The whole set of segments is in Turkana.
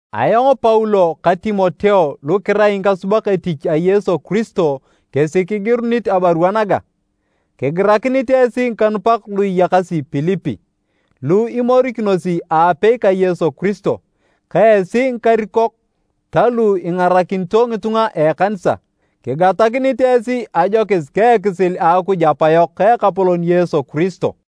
Ayong Paulo ka Timoteo lu kirai ngikasubak etich a Yesu Kiristo kesi kigirunit abarua naga. Kigirakinit esi ngikanupak lu iyakasi Pilipi, lu imorikinosi aapei ka Yesu Kiristo, ka esi ngikarikok ta lu ingarakinito ngitunga a ekanisa. Kigatakinit esi ajokis ka ekisil a Akuj Apayok ka Ekapolon Yesu Kiristo.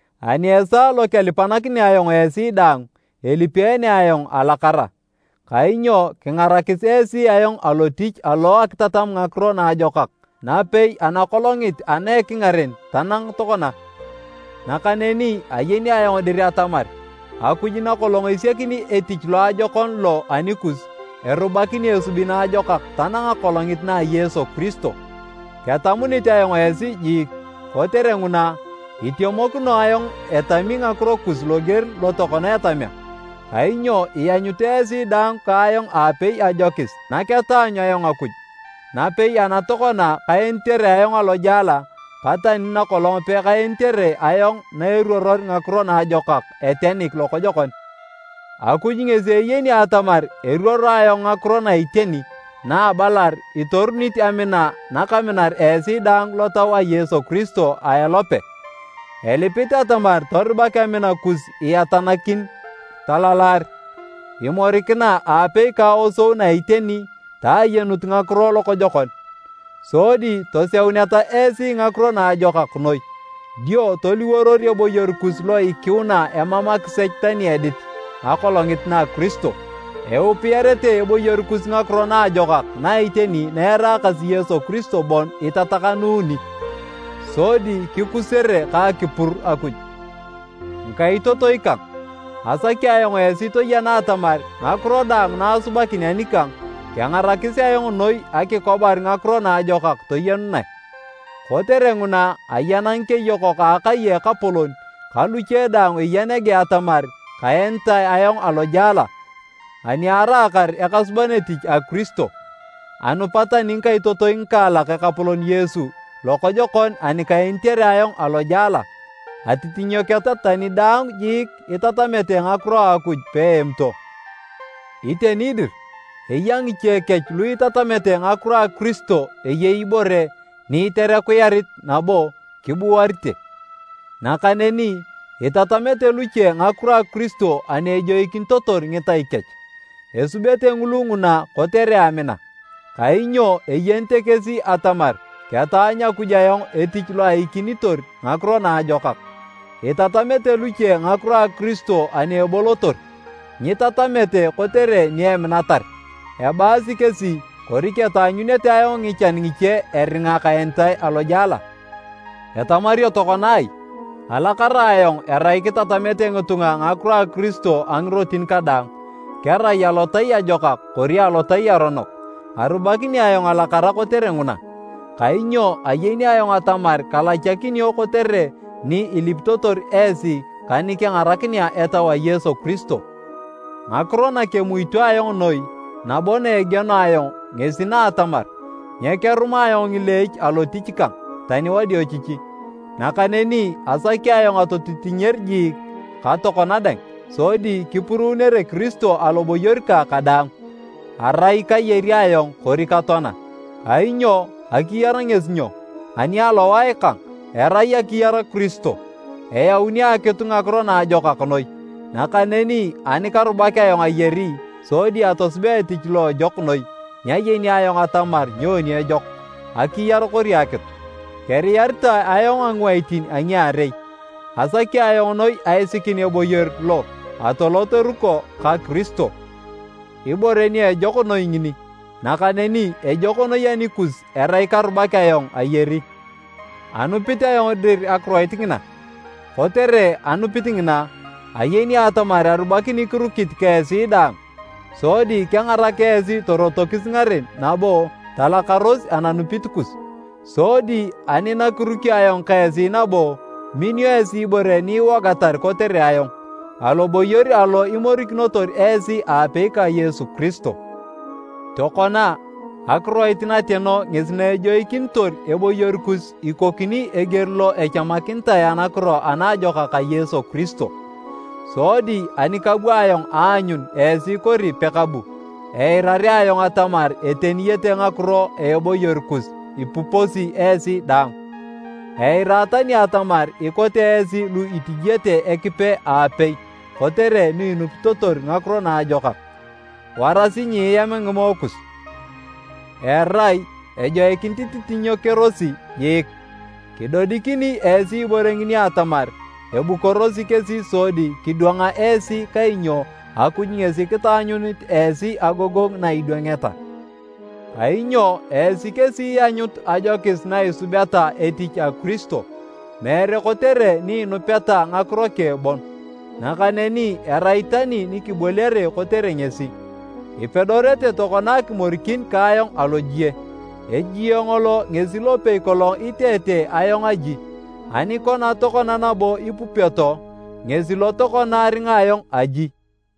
ani esaa lo kelipanakinea ayong esi daang, elipeene ayong alakara. Kainyo kingarakis esi ayong alotich alo a akitatam ngakiro naajokak napei ana kolongit ana ekingaren tanang tokona. Nakaneni ayeni ayong dir atamar, Akuj nakolong esiakini etich loajokon lo anikus, erubakini esubi naajokak tanang Akolongit na a Yesu Kiristo. Ketamunit ayong esi jiik! Kotere nguna, itemokino ayong etami ngakiro kus loger lo tokona etamea. Kainyo ianyut esi daang ka ayong aapei ajokis naketaanyu ayong Akuj, napei ana tokona kaenitere ayong alojela ka tani nakolong pekaenitere ayong na eruoror ngakiro naajokak etenik lokojokon. Akuj ngesi eyeni atamar eruoro ayong ngakiro na iteni na abalar itorunit amina nakaminar esi daang lotau a Yesu Kiristo a elope. Elipit atamar torubak amina kus iatanakin talalar, imorikina aapei ka aosou na iteni ta ayenut ngakiro lokojokon, sodi toseuneta esi ngakiro naajokak noi. Dio toliworor eboyor kus lo ikiuna emam akisech tani edit Akolongit na Kiristo. Eupiyarete eboyor kus ngakiro naajokak na iteni na eraakasi Yesu Kiristo bon itatakanuuni, sodi kikusere ka akipur Akuj. Ngikaitotoi kang, asaki ayong esi toyena atamar ngakiro daang na asubakin anikang, kengarakis ayong noi akikobar ngakiro naajokak toyenunae. Kotere nguna, ayena ngikeyokok a akai a ekapolon ka luche daang eya nege atamar kaenitae ayong alojela ani araakar ekasuban etich a Kiristo. Anupa tani ngikaitotoi ngikaalak Ekapolon Yesu lokojokon ani kaenitere ayong alojela, atitinyoketa tani dang jiik itatamete ngakiro a Akuj peemito. Iteni dir, eya ngiche kech lu itatamete ngakiro a Kiristo eyei ibore ni iterekuyarit nabo kiburuate. Nakaneni, itatamete luche ngakiro a Kiristo ani ejoikinitotor ngitai kech. Esubete ngulu nguna kotere amina, kainyo eyenete kesi atamar ketaanyu Akuj ayong etich lo aikinitor ngakiro naajokak. Itatamete luche ngakiro a Kiristo ani ebolotor, nyitatamete kotere ni eminatar, ebaasi kesi kori ketaanyunete ayong ngichan ngiche eringa kaenitae alojela. Etamario tokona ai! Alakara ayong erai kitatamete ngitunga ngakiro a Kiristo a ngirotin kadaang, kerai alotai ajokak kori alotai aronok. Arubakini ayong alakara kotere nguna, kainyo ayeni ayong atamar kalachakinio kotere ni ilipitotor esi ka ni kengarakinea Etau a Yesu Kiristo. Ngakiro na kemuito ayong noi nabo na egieno ayong ngesi na atamar nyekeruma ayong ngileech alotich kang tani wadiochichi. Nakaneni asaki ayong atotitinyer jiik ka tokona dang, sodi kipuruunere Kiristo aloboyor kang kadaang, erai kayari ayong kori katoana. Kainyo, akiyar ngesi nyo? Ani alowae kang, erai akiyar Kiristo. Eyauni akitu ngakiro naajokak noi. Nakaneni ani karubak ayong ayari sodi atosubea etich lo ejok noi, nyayeni ayong atamar nyoni ejok, akiyar kori akitu. Keriyaritae ayong a ngiwaitin a ngiarei. Asaki ayong noi aisikin eboyor lo atolot eruko ka Kiristo, ibore ejok noi ngini, nakaneni ejok noi anikus erai karubak ayong ayari. Anupit ayong dir akiroit ngina, kotere anupit ngina, ayeni atamar arubakini kirukit ka esi daang, sodi kengarak esi torotokis ngaren nabo talakaros ananupit kus. Sodi ani nakirukio ayong ka esi nabo, minio esi ibore ni iwogatar kotere ayong aloboyor alo imorikinotor esi aapei ka Yesu Kiristo. Tokona, akiroit nateno ngesi na ejoikinitor eboyor kus ikokini eger lo echamakinitae anakiro ana ajokak a Yesu Kiristo. Sodi ani kabu ayong aanyun esi kori pekabu, eirarea ayong atamar eteniyete ngakiro a eboyor kus ipuposi esi daang. Eira tani atamar ikote esi lu itijiete Ekipe aapei kotere ni inupitotor ngakiro naajokak. Warasi nyieam ngimoe kus, erai ejoikinit ititinyekerosi jiik. Kidodikini esi ibore ngini atamar ebukorosi kesi sodi kidwanga esi kainyo Akuj ngesi kitaanyunit esi agogongu na idwangeta. Kainyo esi kesi ianyut ajokis na isubeta etich a Kiristo, meere kotere ni inupeta ngakiro keng bon, nakaneni erai tani nikiboliare kotere ngesi. Ipedorete tokona akimorikin ka ayong alojie. Ejie ngolo ngesi lopei kolong iteete ayong aji, ani kona tokona nabo ipupioto, ngesi lo tokona aringa ayong aji.